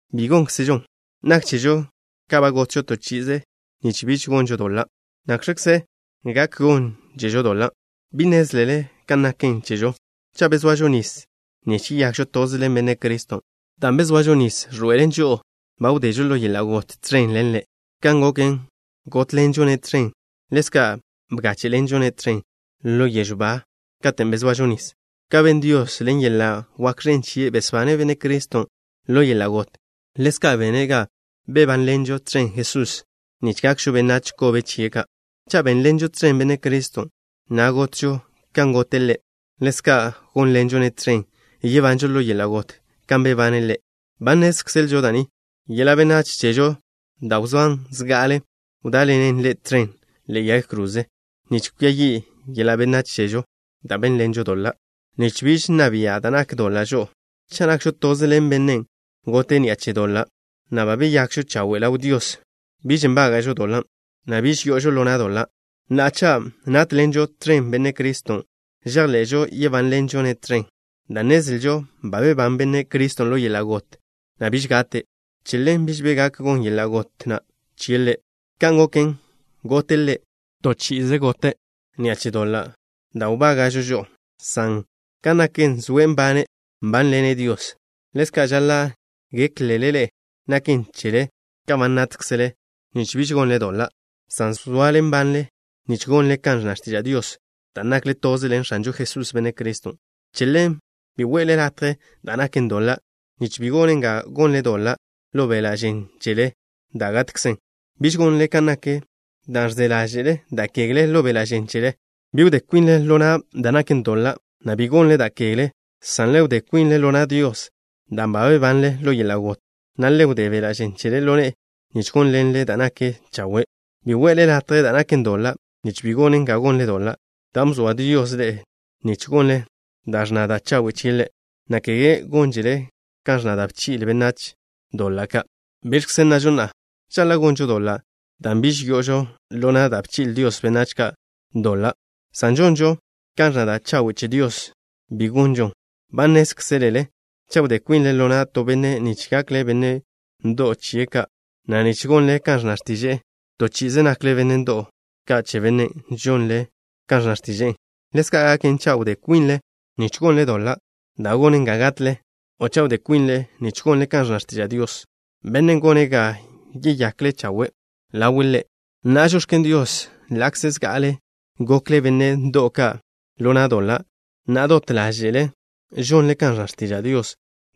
¡Bi gónkzežon! Nak chežo ka ba gotžo to chi'ize nich biž gonžo doḻa'. ¿Nakx̱kze gak gónžežo doḻa'? ¿Bi nnézlele kan naken chežo? Cha' bezoažo nis nich yeyakžo toze ḻen Benne' Criston', dan' bezoažo nis ẕḻoe'elen žo'o ba wdežo ḻo yeḻa' got tẕen ḻen Ḻe'. Kan goken, gótḻenžo-ne' tẕen, ḻezka' bgáche'ḻenžo-ne' tẕen ḻo yežw ba katen' bezoažo nis. Kan ben Dios, ḻen yeḻa' wak ẕen chie' besbane' Benne' Criston' ḻo yeḻa' got, ḻezka' bene' ga bebánḻenžo tẕen Jesusen' nich gakžo benách kobe chie' ka'. Cha' bénḻenžo tẕen Benne' Criston', na' gotžo kan gote' Ḻe', ḻezka' gónḻenžo-ne' tẕen, yebanžo ḻo yeḻa' got kan bebane' Ḻe'. Ba nnézkzelžo da' ni: yeḻa' benách chežo da' wzóan zga'ale, wdá'ḻenen Ḻe' tẕen ḻe'e yag kroze nich kwia yi' yeḻa' benách chežo da' bénḻenžon doḻa', nich biž nna bia' da' nak doḻa' žo'o. Cha' nakžo toze ḻen Bennen' gote' ni'a che doḻa', na' ba beyakžo chawe' ḻaw Dios, biž nbága'žo doḻan', na' biž yo'ožo ḻo na' doḻa'. Na'a, cha' nátḻenžo tẕen Benne' Criston', žejḻe'žo yebánḻenžo-ne' tẕen, dan' nnezlžo ba bebán Benne' Criston' ḻo yeḻa' got, na' biž gate'. Che ḻen biž bi gak gon yeḻa' got na' chie' Ḻe'. Kan goken, gote' Ḻe', toze chi'i gote' ni'a che doḻa' da' wbága'žo žo'o, san kan naken, zoe' nbane', nbánḻene' Dios. Ḻezka' žaḻa' géklele ḻe'e naken chele ka ba nátkzele nich biž gonle doḻa', san zoale nbanle nich gonle kan ẕnna x̱tiža' Dios, dan' nakle toze ḻen X̱anžo Jesús, Benne' Criston'. Che ḻen, bi we'le latje da' naken doḻa', nich bi gonen ga gonle doḻa' ḻo beḻa' žen chele da' gatkzen. Biž gonle kan nak da' ẕze ḻáže'le da' kegle ḻo beḻa' žen chele. Bi wdé kwinle ḻo na' da' naken doḻa', na' bi gonle da' kegle, san le wdé kwinle ḻo na' Dios dan' ba bebanle ḻo yeḻa' got, na' le wdé beḻa' žen chele ḻo ne'e nich gónḻenen' da' naken chawe'. Bi we'le latje da' naken doḻa', nich bi gonen ga gonle doḻa', dan' bzoa Dios ḻe'e nich gonle kan ẕnna da' chawe' chie' Ḻe', na' kege gónžele kan ẕnna da' bchi'le' benách doḻa' ka'. ¿Biẕkze nnažo na'a? ¿Žaḻa' gonžo doḻa' dan' biž yo'ožo ḻo na' da' bchi'le Dios benách doḻa' ka', san žonžo kan ẕnna da' chawe' che Dios? ¡Bi gonžon! Ba nnézkzelele cha' wdé kwinle ḻo na' to benne' nich gakle benne' ndo'w chie' ka', na' nich gonle kan ẕnna x̱tiže'e, to chi'ize nakle benne' ndo'w ka' che bennen' žonle kan ẕnna x̱tiže'e. Ḻezka' gaken cha' wdé kwinle nich gonle doḻa' da' gonen ga gatle, o cha' wdé kwinle nich gonle kan ẕnna x̱tiža' Dios, Bennen' gone' ga yeyakle chawe' ḻawe' Ḻe'. Na'a, žox̱ken Dios. Ḻa'kze zga'ale gokle benne' ndo'w ka' ḻo na' doḻa', na'a dot ḻáže'le žonle kan ẕnna x̱tiža' Dios,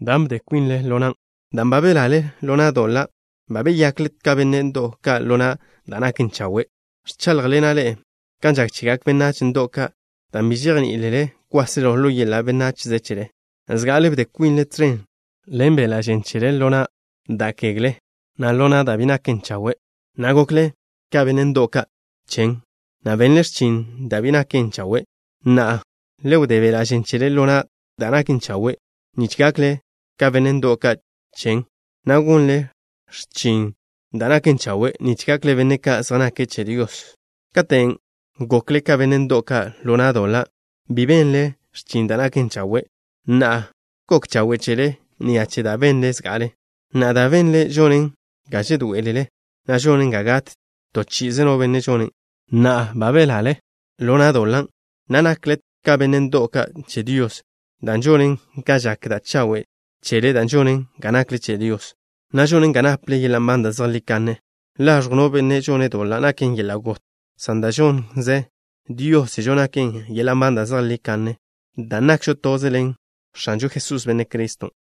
dan' bde kwinle ḻo nan'. Dan' ba belale ḻo na' doḻa', ba beyakle ka benne' ndo'w ka' ḻo na' da' naken chawe'. Ẕcháḻjḻena' ḻe'e kan žak chegak benách ndo'w ka', dan' bi žejní'ilele kwáselo ḻo yeḻa' benachze chele. Zga'ale bde kwinle tẕen ḻen beḻa' žen chele ḻo na' da' kegle, na' ḻo na' da' bi naken chawe', na' gokle ka benne' ndo'w ka' chen, na' benle x̱chin da' bi naken chawe'. Na'a, le wdé beḻa' žen chele ḻo na' da' naken chawe', nich gakle ka benne' ndo'w ka' chen, na' gonle x̱chin da' naken chawe' nich gakle benne' ka' zej nake' che Dios. Katen' gokle ka benne' ndo'w ka' ḻo na' doḻa', bi benle x̱chin da' naken chawe'. Na'a, ¿gok chawe' chele ni'a che da' benle zga'ale? Na'a dan' benle žonen ga žedoé'elele, na' žonen ga gat to chi'ize no benne' žonen'. Na'a ba belale ḻo na' doḻa', na' nakle ka benne' ndo'w ka' che Dios, dan' žonen ga žak da' chawe' chele dan' žonen ga nakle che Dios, na' žonen ga naple yeḻa' nban da' zejlí kanne. Laẕjw no benne' žone' doḻa' naken yeḻa' got, san da' žonnze Dios chežo naken yeḻa' nban da' zejlí kanne, dan' napžo dan' nakžo toze ḻen X̱anžo Jesús, Benne' Criston'.